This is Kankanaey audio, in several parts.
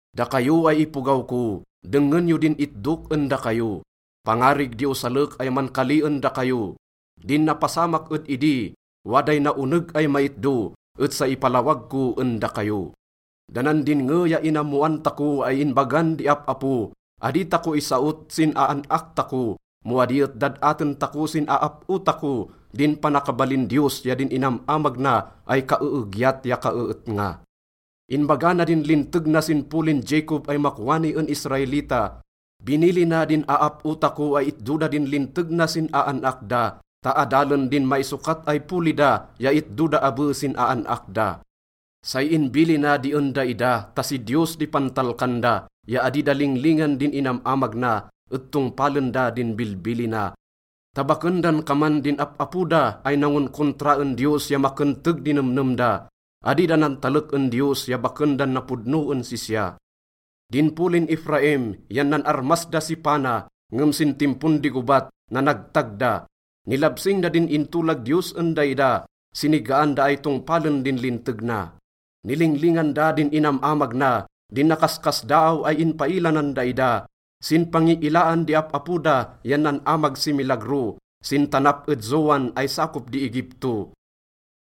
Dakayo ay ipogaw ko, dengngen yo din itdok en dakayo. Pangarig di osalek ay mankali en dakayo. Din napasamak ed idi, waday naoneg ay maitdo, et say ipalawag ko en dakayo. Da nan dinnge ya inammoan tako ay inbagan di ap-apo, adi tako isaot sin aan-ak tako, mo adi et dad-aten tako sin aap-o tako din panakabalin Diyos ya din inam-amag na ay kaeegyat ya kaeetnga. Inbaga na din linteg na sin polin Jacob ay makwani en Israelita. Binilina din aap-o tako ay itdo da din linteg na sin aan-ak da ta adalen din maisokat ay poli da ya itdo da abe sin aan-ak da. Say inbilina di en daida ta si Diyos di pantalkan da ya adi da linglingan din inam-amag na et tongpalen da din bilbilina ta baken dan kaman din ap-apo da ay nangonkontra en Diyos ya makenteg di nemnem da. Adi da nantalek en Diyos ya baken dan napodno en sisya. Din polin Efraim yan nan-armas da si pana, ngem sin timpon di gobat, nanagtag da. Nilabsing da din intolag Diyos en daida, sinigaan da ay tongpalen din linteg na. Nilinglingan da din inam-amag na, din nakaskasdaaw ay inpaila nan daida. Sin pangiilaan di ap-apo da yan nan-amag si milagro sin tanap ed Zoan ay sakop di Egipto.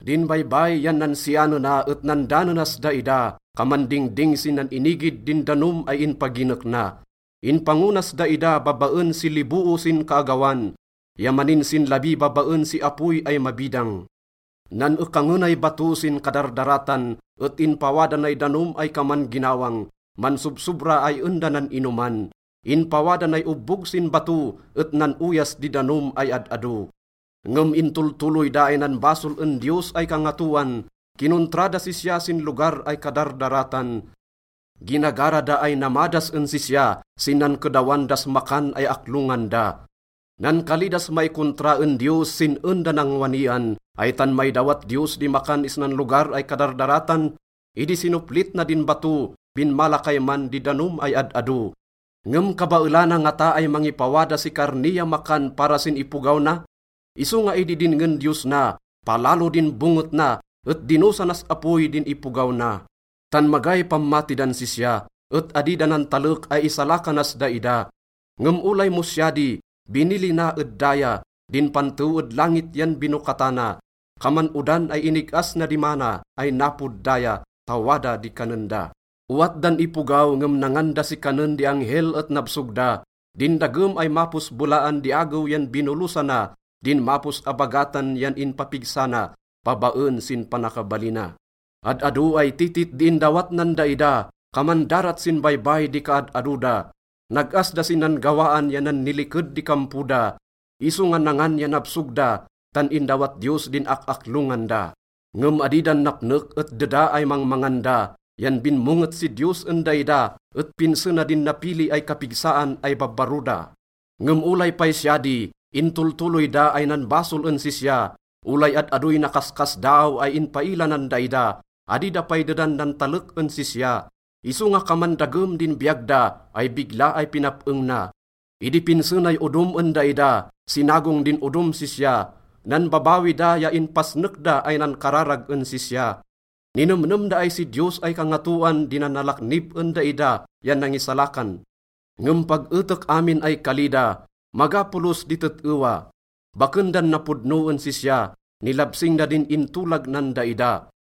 Din baybay yan nansianena et nandanenas daida, kaman dingding sin nan-inigid din danom ay inpaginek na. Inpango nas daida babaen si liboo sin kaagawan ya maninsinlabi babaen si apoy ay mabidang. Nan-ekangenay bato sin kadardaratan et inpawada nay danom ay kaman ginawang, mansobsobra ay en da nan-inoman. Inpawada nay obbog sin bato et nan-oyas di danom ay ad-ado. Ngem intoltoloy da ay nanbasol en Diyos ay Kangatoan, kinontra das sisya sin lugar ay kadardaratan. Ginagara da ay namadas en sisya sin nankedawan das makan ay aklongan da. Nankali das maikontra en Diyos sin en da nangwanian, “Ay tan maidawat Diyos di makan isnan lugar ay kadardaratan? Idi sinoplit na din bato, binmala kayman di danom ay ad-ado. Ngem kabaelana ngata ay mangipawada si karni ya makan para sin ipogaw na?” Isonga idi dinngen Diyos na, palalo din bonget na et dinosanas apoy din ipogaw na. Tan magay pammati dan sisya, et adi da nantalek ay isalakanas daida. Ngem olay mo siya di, binilina ed daya, din pantew ed langit yan binokatana. Kaman odan ay inig-as na di manna ay napod daya ta wada di kanen da. Owat dan ipogaw ngem nangan da si kanen di angel et nabsog da. Din dagem ay mapos belaan di agew yan binolosana, din mapos abagatan yan inpapigsa na babaen sin panakabalina. Ad-ado ay titit di indawat nan daida, kaman darat sin baybay di kaad-ado da. Nag-as da sin nan-gawaan ya nanniliked di kampo da. Isonga nangan ya nabsog da, tan indawat Diyos din ak-aklongan da. Ngem adi dan napnek et deda ay mangmangan da yan binmonget si Diyos en daida et pinse na din napili ay kapigsaan ay babbaro da. Ngem olay pay siya di, intoltoloy da ay nanbasol en sisya. Olay ad-adoy nakaskasdaaw ay inpaila nan daida, adi da pay dedan nantalek en sisya. Isonga kaman dagem din biyag da ay bigla ay pinap-eng na. Idi pinse nay odom en daida, sinagong din odom sisya. Nanbabawi da ya inpasnek da ay nankararag en sisya. Ninemnem da ay si Diyos ay Kangatoan di nanalaknib en daida ya nangisalakan. Ngem pag etek amin ay kali da, maga polos di tet-ewa. Baken dan napodno en sisya, nilabsing da din intolag nan daida.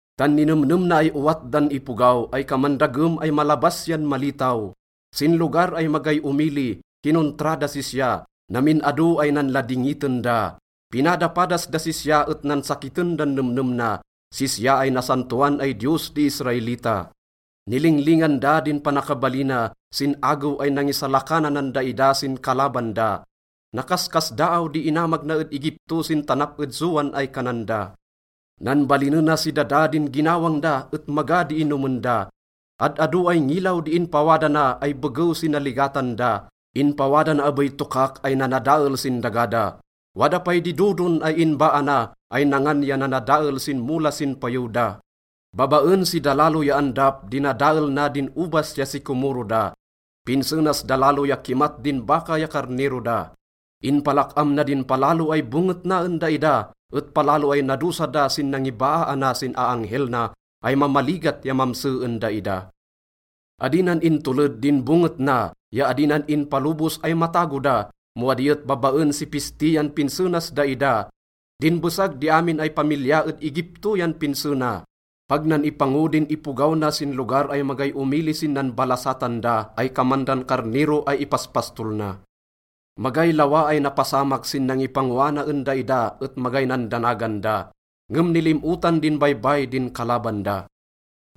Tan ninemnem na ay owat dan ipogaw ay kaman dagem ay malabas yan malitaw. Sin lugar ay magay omili, kinontra das sisya, namin ado ay nanladingiten da. Pinadapadas das sisya et nansakiten dan nemnem na, sisya ay nasantoan ay Diyos di Israelita. Nilinglingan da din panakabalina sin agew ay nangisalakananan daida sin kalaban da. Nakaskasdaaw di inamag na ed Egipto sin tanap ed Zoan ay kanan da. Nanbalinena si dada din ginawang da et maga di inomen da. Ad-ado ay ngilaw di inpawada na ay begew si naligatan da. Inpawada na abey tokak ay nanadael sin daga da. Wada pay di dodon ay inbaa na ay nangan ya nanadael sin mola sin payew da. Babaen si dalalo ya andap, dinadael na din obas ya sikomoro da. Pinse nas dalalo ya kimat din baka ya karnero da. Inpalak-am na din palalo ay bonget na en daida, et palalo ay nadosa da sin nangibaaana sin aanghel na ay mamaligat ya mamse en daida. Adi nan intoled din bonget na ya adi nan inpalobos ay matago da, mo adi et babaen si pisti yan pinse nas daida. Din besag di amin ay pamilya ed Egipto yan pinse na. Pag nan ipango din ipogaw na sin lugar ay magay omili sin nanbalasatan da ay kaman dan karnero ay ipaspastol na. Magay lawa ay napasamak sin nangipangoana en daida et magay nandanagan da, ngem nilim-otan din baybay din kalaban da.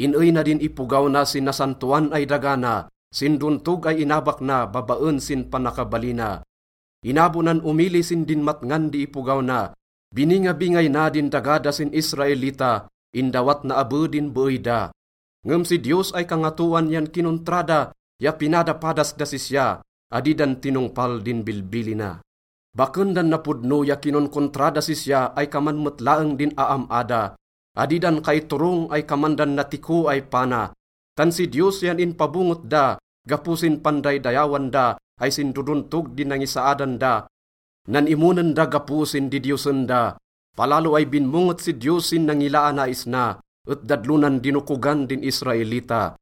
In-ey na din ipogaw na sin nasantoan ay daga na, sin dontog ay inabak na babaen sin panakabalina. Inabo nan omili sin dinmatngan di ipogaw na, biningabingay na din daga da sin Israelita, indawat na abe din beey da. Ngem si Diyos ay Kangatoan yan kinontra da ya pinadapadas das sisya, adi dan tinongpal din bilbilina. Baken dan napodno ya kinonkontra das sisya ay kaman met laeng din aam-a da. Adi dan kaiturong ay kaman dan natiko ay pana. Tan si Diyos yan inpabonget da gapo sin pandaydayawan da ay sin dodontog di nangisaadan da. Nan-imonen da gapo sin didiyosen da. Palalo ay binmonget si Diyos sin nangilaana isna, et dadlonan dinokogan din Israelita.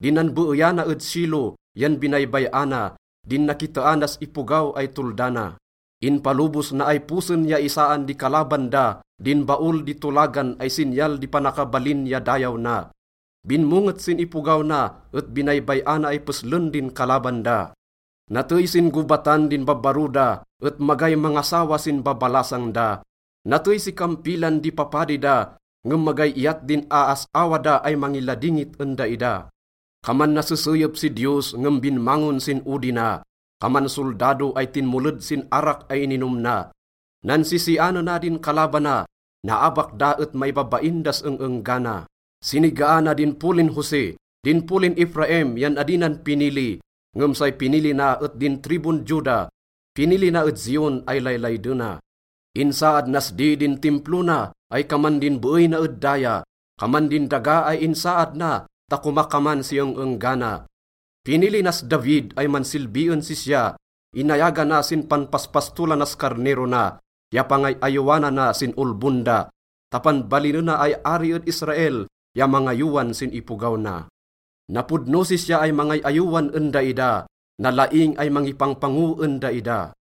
Din nanbeeyana ed Shilo yan binaybay-ana, din nakiteanas ipogaw ay tolda na. Inpalobos na ay posen ya isaan di kalaban da din Baol di Tolagan ay sinyal di panakabalin ya dayaw na. Binmonget sin ipogaw na et binaybay-ana ay peslen din kalaban da. Natey sin gobatan din babbaro da, et magay mangasawa sin babalasang da. Natey si kampilan di papadi da, ngem magay iyat din aas-awa da ay mangiladingit en daida. Kaman naseseyep si Diyos ngem binmangon sin odi na, kaman soldado ay tinmoled sin arak ay ininom na. Nansisianena din kalabana, naabak da et maibabain das eng-enggana. Sinigaana din polin Jose, din polin Efraim yan adi nan pinili. Ngem say pinili na et din tribun Juda, pinili na ed Zion ay laylaydena. Insaad nas di din Timplo na ay kaman din beey na ed daya, kaman din daga ay insaad na ta komakaman si eng-enggana. Pinili nas David ay mansilbi en sisya, inayagana sin panpaspastolanas karnero na ya pangay-ayowanana sin olbon da ta panbalinena ay ari ed Israel ya mangayowan sin ipogaw na. Napodno sisya ay mangay-ayowan en daida, nalaing ay mangipangpango en daida.